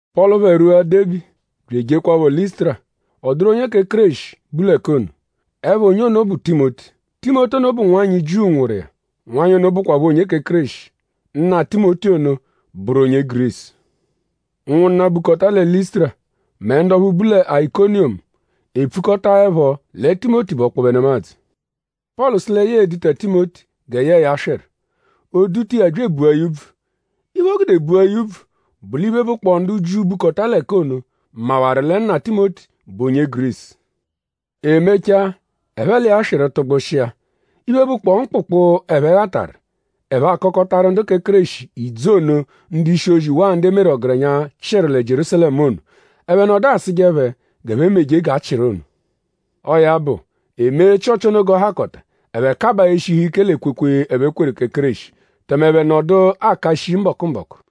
Pọlu phẹ rwua Debi bya ejekwaphọ Lịsutura. Ọ dụru onye kẹ Kéreshi, bu l'ẹka ono. Ẹpha onye ono bụ Timoti. Timoti ono bụ nwanyị Jiu nwụru iya. Nwanyị ono bụkwapho onye kẹ Kéreshi. Nna Timoti ono bụru onye Gurisu. Ụnwunna, bukọta lẹ Lịsutura mẹ ndu ọphu bu lẹ Ayikoniyomu epfukọtaepho lẹ Timoti bụ ọkpobe nemadzụ. Pọlu sụ lẹ ya e-duta Timoti gẹ yẹe ya swịru. O duta iya bya ebua ya úbvù. Iphe, o gude bua ya úbvù bụ l'iphe, bụkpoo ndu Jiu, bukọta l'ẹka ono mawaru lẹ nna Timoti bụ onye Gurisu. E mechaa; ẹphe l'iya swịru tụgbushia. Iphe, bụkpoo mkpụkpu, ẹphe ghataru; ẹphe akọkotaru ndu kẹ Kéreshi ìdzù ono, ndu-ishi-ozi waa ndu e meru ọgerenya chịru lẹ Jierúsalẹmu ono. Ẹphe nọdu asụje phẹ g'ẹphe meje g'a chịru ono. Ọo ya bụ; e mee Chịochi ono g'ọ hakọta; ẹphe kabaa eshihu ike l'ekwekwe, ẹphe kweru kẹ Kéreshi; tẹme ẹphe nọdu aka shii mbọku-mbọku.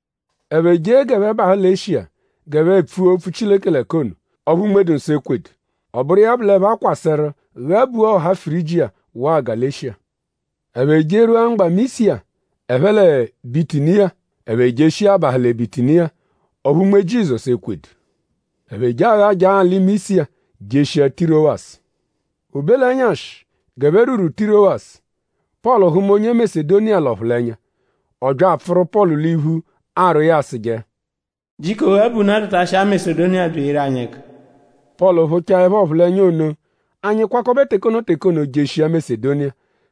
Ẹphe jee g'ẹphe bahụ lẹ Eshiya g'ẹphe epfua opfu Chileke l'ẹka ono; ọphu Unme-dụ-Nsọ ekwedu. Ọ bụru iya bụ l'ẹphe akwasẹru ghabua ọha Firijiya waa Galeshiya. Ẹphe jerwua mgba Misiya ẹphe lẹ Bitiniya; ẹphe jeshia abahụ lẹ Bitiniya; ọphu Unme Jizọsu ekwedu. Ẹphe je aghajaa alị Misiya jeshia Tirowasu. O be l'ẹnyashi g'ẹphe rwuru Tirowasu; Pọlu hụma onye Masedoniya l'ọphulenya. Ọ bya apfụru Pọlu l'iphu arwọ iya asụje: “Jiko ghabunaa byatashia Masedoniya bya eyeru anyi ẹka!” Pọlu phụchaepho ọphulenya ono; anyi kwakọbe teke ono teke ono jeshia Masedoniya;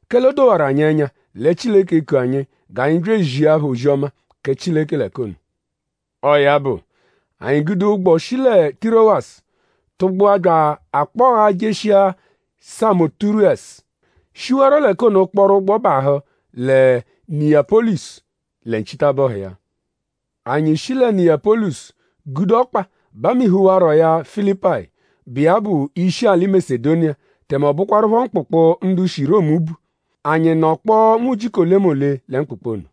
kẹle o dowarụ anyi ẹnya lẹ Chileke eku anyi g'anyi bya ezia phẹ ozi-ọma kẹ Chileke l'ẹka ono. Ọo ya bụ; anyi gude ụgbo shi lẹ Tirowasu tụgbua bya akpọghaa jeshia Samoturesu; shiwarọ l'ẹka ono kpọru ụgbo bahụ lẹ Niyapọlisu lẹ nchitabọhu iya. Anyi shi lẹ Niyapọlisu gude ọkpa bamihuwarọya Filipayi, bụ iya bụ ishi alị Masedoniya; tẹme ọ bụkwarupho mkpụkpu, ndu shi Romu bu. Anyi nọkpoo nwujiku olemole lẹ mkpụkpu ono.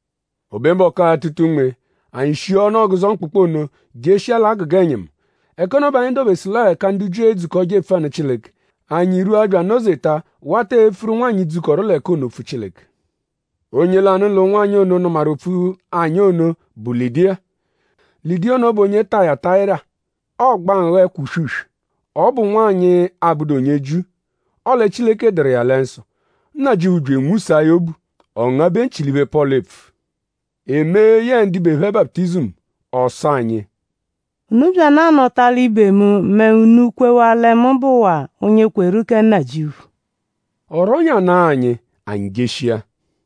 O be mbọku atụta unme; anyi shia ọnu ọguzo mkpụkpu ono jeshia l'agụga ẹnyimu. Ẹka ono bẹ anyi dobesu l'ọo ẹka ndu Jiu edzukọje epfu anụ Chileke. Anyi rwua bya anọ-zeta wata epfuru ụnwanyi, dzukọru l'ẹka ono opfu Chileke. Onye lanụ l'ụnwanyi ono, nụmaru opfu anyi ono bụ Lịdiya. Lịdiya ono bụ onye Tayatayira. Ọogba nghọ ẹkwa uswe-uswe. Ọ bụ nwanyị, abụdu onye Jiu; ọle Chileke dụru iya lẹ nsọ. Nnajịuphu bya anwụsaa ya obu; ọ ngabẹ nchị l'iphe, Pọlu epfu. E mee yẹe ndibe phẹ baputizimu. Ọ sụ anyi: “Unu byanụ anọta l'ibe mu mẹ unu -kwewaa lẹ mu bụwaa onye kweru kẹ Nnajịuphu.” Ọ rwọnyanaa anyi; anyi jeshia.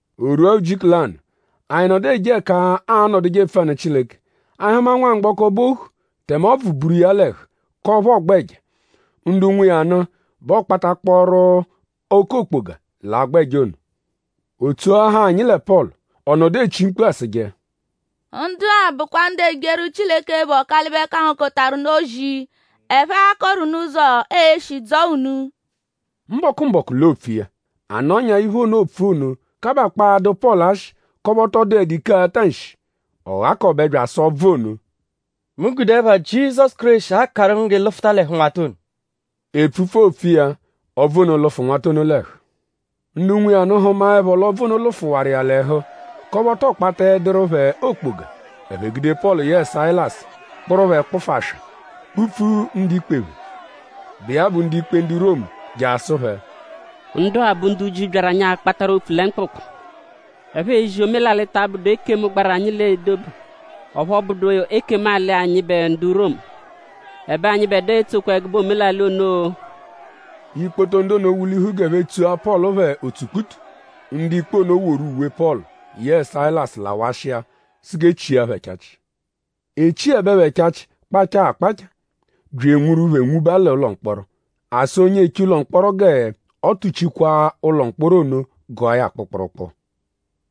O rwua ujiku lanụ; anyi nọdu eje ẹka aanọduje epfu anụ Chileke; anyi hụma nwamgbọko, bụ ohu; tẹme ọbvu buru iya l'ẹhu k'ọphu ọogba ẹja. Ndu nwe iya nụ bẹ ọokpatakpooru oke okpoga l'agba ẹja ono. O tsoahaa anyi lẹ Pọlu. Ọ nọdu echi mkpu asụje: “Ndu-a bụkwa ndu ejeru Chileke, bụ Ọkalibe-Kangokọtaru-nụ ozi. Ẹphe aakọru unu ụzo, ee-shi dzọo unu.” Mbọku-mbọku l'oopfu iya. A nọnyaa iphe ono, oopfu ono kabakpọo adụ Pọlu ashị k'ọphu ọ tọ dụedu ike ata nshi. Ọ ghakọbe bya asụ ọbvu ono: “Mu gude ẹpha Jizọsu Kéreshi akarụ ngu g'ị lụfuta l'ẹhu nwata ono!” Epfupfu, oopfu iya; ọbvu ono lụfu nwata ono l'ẹhu. Ndu nwe iya nụ hụmaepho l'ọbvu ono lụfuwaru iya l'ẹhu k'ọphu ọ tọ kpataẹduru phẹ okpoga; ẹphe gude Pọlu yẹe Sayilasu kpụru phẹ kpụfu aswa; kpupfu ndu-ikpe phẹ, bụ iya bụ ndu-ikpe ndu Romu; je asụ phẹ: “Ndu-a bụ ndu Jiu, byaru anyi akpataru opfu lẹ mkpụkpu. Ẹphe ezi omelalị, ta abụdu ekemu-alị, gbaru anyi l'edobe; ọphu ọ bụdu ekemu-alị anyịbe ndu Romu. Ẹbe anyịbedua etsokwa ẹgube omelalị ono-o!” Ikpoto ndu ono wulihu g'ẹphe tsua Pọlu phẹ otsukputu; ndu-ikpe ono woru uwe Pọlu yẹe Sayilasu lawashia sụ g'e chia phẹ ẹchachi. E chiẹbe phẹ ẹchachi kpachaa akpachaa; bya enwuru phẹ nwuba l'ụlo mkpọro. A sụ onye eche ụlo mkpọro g'ọ tuchikwaa ụlo mkpọro ono gụa ya kpụkpurukpu.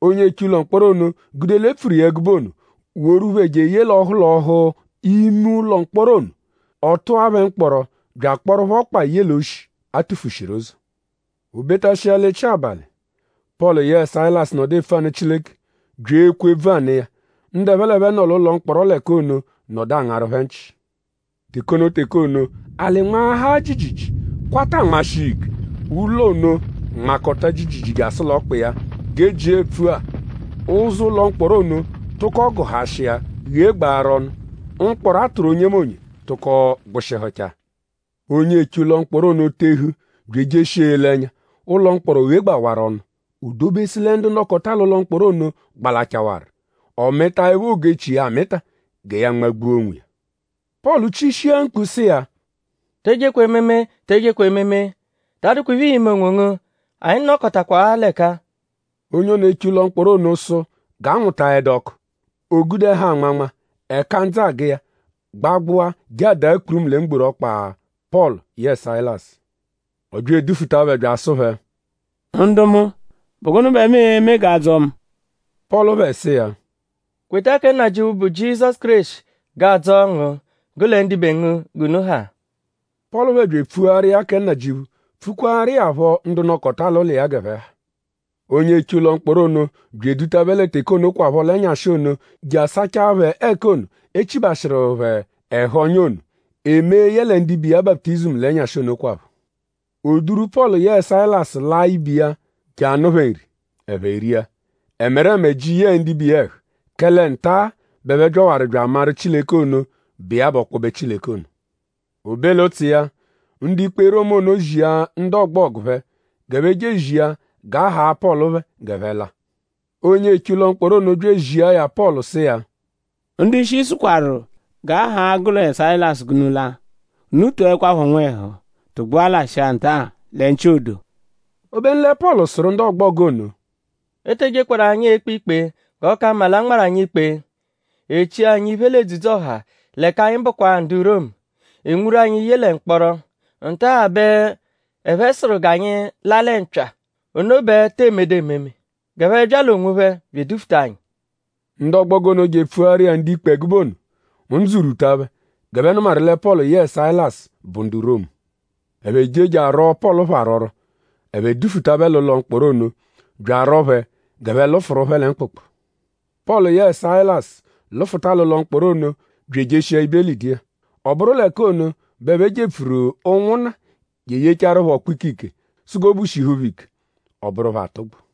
Onye eche ụlo mkpọro ono gude l'e pfuru ẹgube ono woru phẹ jeye l'ọhu l'ọhu ime ụlo mkpọro ono. Ọ tụa phẹ mkpọro bya akpọru phẹ ọkpa ye l'oshi, a tufushiru ụzo. O betashia l'echi abalị; Pọlu yẹe Sayilasu nọdu epfu anụ Chileke bya ekwe ebvu anụ iya. Ndu ẹphe l'ẹphe nọ l'ụlo mkpọro l'ẹka ono nọdu angaru phẹ nchị. Teke ono teke ono; alị nmaahaa jiijiijii; kwata anmashị iya ike. Ụlo ono nmakọta jiijiijii jasụ l'ọkpa iya. G'e jia epfua; ụzo ụlo mkpọro ono tụko gụhashia ghegbaru ọnu. Mkpọro, a tụru onyemonye tụko gbụshihuchaa. Onye eche ụlo mkpọro ono tehu bya ejeshia ele ẹnya; ụlo mkpọro ghegbawaaru ọnu. O dobesu lẹ ndu nọkota l'ụlo mkpọro ono gbalachaawaru. Ọ mịtaepho ogu-echi iya amịta gẹ ya nmagbua onwiya. Pọlu chishia mkpu sụ iya: “Te ejekwa ememe! Te ejekwa ememe! Ta adụkwa iphe, ii-me onwongu! Anyi nọkotakwaa l'ẹka-a!” Onye ono, eche ụlo mkpọro ono sụ g'a nwụtaedu ọku. O gude ẹhu anmanma; ẹka ndzụ agụ iya gbagbụa je adaa kpurumu lẹ mgboru ọkpa Pọlu yẹe Sayilasu. Ọ bya edufuta phẹ bya asụ phẹ: “Ndu mu;?bụ gụnu bẹ mu e-me g'a dzọo mu?” Pọlu phẹ sụ iya: “Kweta kẹ Nnajịuphu, bụ Jizọsu Kéreshi g'aa-dzọo ngu; gụ lẹ ndibe ngu g'unu ha.” Pọlu phẹ bya epfuaru iya kẹ Nnajịuphu; pfukwaaru iya phọ ndu nọkota l'ụlo iya g'ẹphe ha. Onye eche ụlo mkpọro ono bya eduta phẹ lẹ teke onokwaphọ l'ẹnyashi ono je asachaa phẹ ẹka ono, e chibashịru phẹ ẹhu ọ́nyá ono. E mee yẹle ndibe iya baputizimu l'ẹnyashi onokwaphọ. O duru Pọlu yẹe Sayilasu laa ibe iya je anụ phẹ nri; ẹphe ria. Ẹmereme ji yẹe ndibe iya ẹhu; kẹle nta-a bẹ ẹphe byawaru bya amaru Chileke ono, bụ iya bụ ọkpobe Chileke ono. O be l'ụtsu iya; ndu-ikpe Romu ono zia ndu ọgbogu phẹ g'ẹphe je ezia g'a haa Pọlu phẹ g'ẹphe la. Onye eche ụlo mkpọro ono bya ezia ya Pọlu; sụ iya: “Ndu-ishi sụkwaru g'a haa gụ lẹ Sayilasu g'unu la. Unu tọekwapho nwẹhu tụgbua lashịa nta-a lẹ nchị odo.” Obenu lẹ Pọlu sụru ndu ọgbogu ono: “E te ejekwaru anyi ekpe ikpe; g'ọ ka mma l'a nmarụ anyi ikpe. E chia anyi iphe l'edzudzu-ọha; l'ẹka anyi bụkwa-a ndu Romu. E nwuru anyi ye lẹ mkpọro. Nta-a bẹ ẹphe sụru g'anyi la lẹ mpya. Ono bẹ tee medu ememe! G'ẹphe bya l'onwophẹ bya edufuta anyi.” Ndu ọgbogu ono je epfuaru ndu-ikpe ẹgube ono. Ndzụ rwuta phẹ g'ẹphe nụmaru lẹ Pọlu yẹe Sayilasu bụ ndu Romu. Ẹphe je je arwọo Pọlu phẹ arwọrwo. Ẹphe dufuta phẹ l'ụlo mkpọro ono bya arwọo phẹ g'ẹphe lụfuru phẹ lẹ mkpụkpu. Pọlu yẹe Sayilasu lụfuta l'ụlo mkpọro ono bya ejeshia ibe Lịdiya. Ọ bụru l'ẹka ono bẹ ẹphe jepfuru ụnwunna je yechaaru phẹ ọkpukpu ike sụ g'obu shihu phẹ ike; ọ bụru phẹ atụgbu.